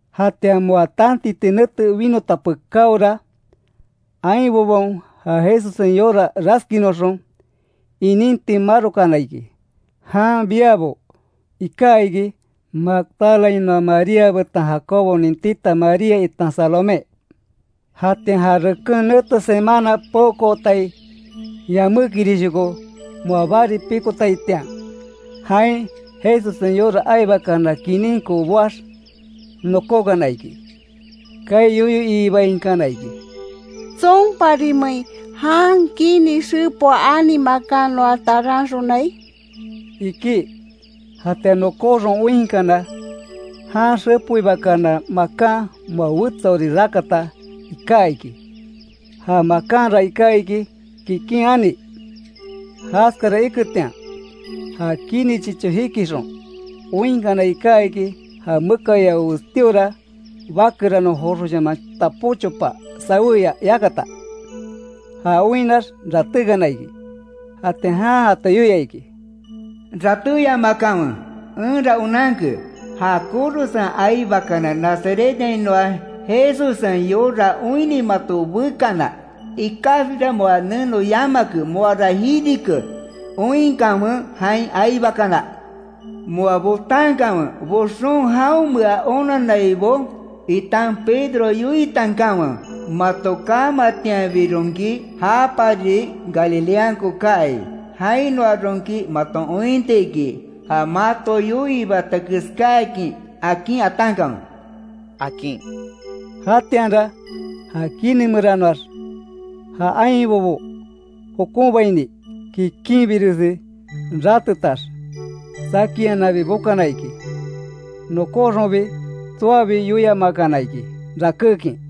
Jatian moa tantiti nete winota pekáora, ainbobaon ja Jesussen yora raskinoxon, ininti marokana iki, jan biabo iká iki, Magdalainoa María betan Jacobonin tita María itan Salomé. Jatian ja reken nete semana peokootai yamékirishoko moa bari pikotaitian, jain Jesussen yora aibakana kininko boax nokókana iki. Kaai yoyo iibainkana iki: —¿Tsonparimein, jan kini xepoa ani makan noa taranxonai? —iki. Jatian nokóxon oinkana, jan xepoibakana makan moa wetsaori rakata iká iki. Ja makanra iká iki kikin ani. Jaskara iketian, ja kini chicho jikixon oinkana iká iki, ja mekayao westíora bakeranon joxoshaman tapó chopa sawéya yakata. Já oinnax ratékana iki. Jatian jan jato yoia iki: —Ratéyamakanwe, enra onanke, ja korosen aibakana Nazarethainoa Jesussen yora oinni mato bekana. Ikaxbira moa neno yamake; ¡Moara jirike! Oinkanwe jain aibakana. Moa botankanwe; boxon jaonmea onannaibo, itan Pedro yoitankanwe: ‘Mato kaamatianbironki, japari Galileanko kaai, jainoaronki maton ointi iki, ja mato yoiibata keskáakin’, akin atankanwe —akin. Jatianra, ja kini meranoax, ja ainbobo jokonbaini, kikinbiresi ratetax, saki iananbi bokana iki. Nokóxonbi tsoabi yoiamakana iki, rakékin.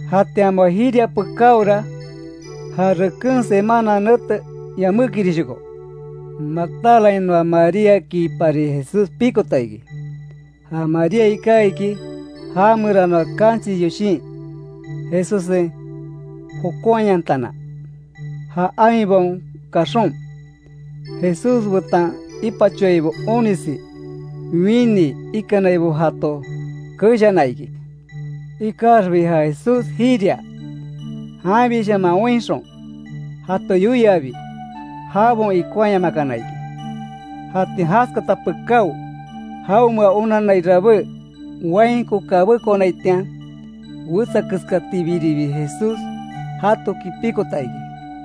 Jatian moa jiria pekáora, ja reken semana nete yamékirishoko, Magdalainoa Maríakipari Jesús pikota iki. Ja María iká iki, ja meranoa kanchis yoshin, Jesussen jokonhayantana. Ja ainbaon kaxon, Jesús betan ipachoaibo onisi, winii ikanaibo jato keshana iki. Ikaxbi ja Jesús jiria, janbishaman oinxon, jato yoiabi, jabaon ikonhaayamakana iki. Jatian jaskata pekáo, jaonmea onanai rabé, wainko kabékonaitian wetsakeskatibiribi, Jesús jatoki pikota iki.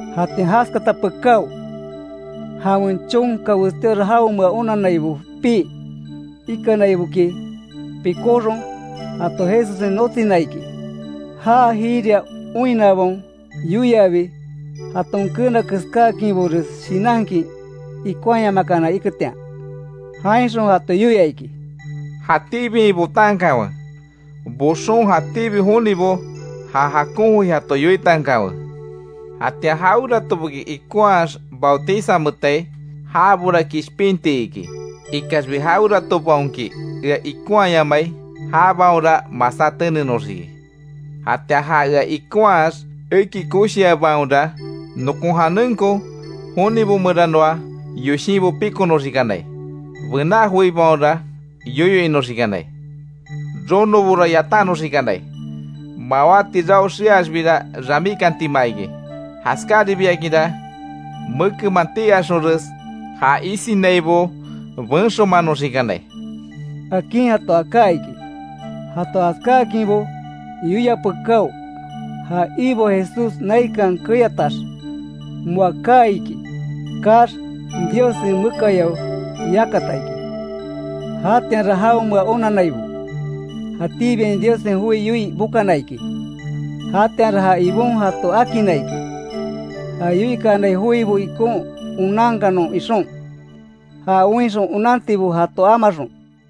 Jatian jaskata pekáo, jawen chonka westíora jaonmea onannaibo pii ikanaiboki, pikóxon, jato Jesussen notsina iki, já jiria oinnabaon yoiabi, jaton keena keskáakinbores shinankin ikonhayamakana iketian. Jainxon jato yoia iki: —Jatíbiain botankanwe, boxon jatíbi jonibo ja jakon joi jato yoitankanwe. Jatian jaweratoboki ikonhaax bautizameetai, jabora kishpinti iki. Ikaxbi jaweratobaonki ea ikonhaayamai, jabaonra masá tenenoxiki. Jatian ja ea ikonhaax, eki koshiabaonra; nokon janenko, jonibo meranoa yoshinbo pikonoxikanai, bená joibaonra yoyo inoxikanai, ronobora yatannoxikanai, mawáti rao xeaxbira ramíkantima iki. Jaskaribiakinra mekenman tii axonres ja isinaibo benxomanoxikanai —akin jato aká iki. Jato jaskaákinbo yoia pekáo, ja Ibo Jesús naikan keyatax, moa kaa iki. Kaax, Diossen mekayao yakata iki. Jatianra jaonmea onannaibo, jatíbiain Diossen joi yoii bokana iki, jatianra ja Ibon jato akinna iki, ja yoikanai joibo ikon onankanon ixon, ja oinxon onantibo jato amaxon.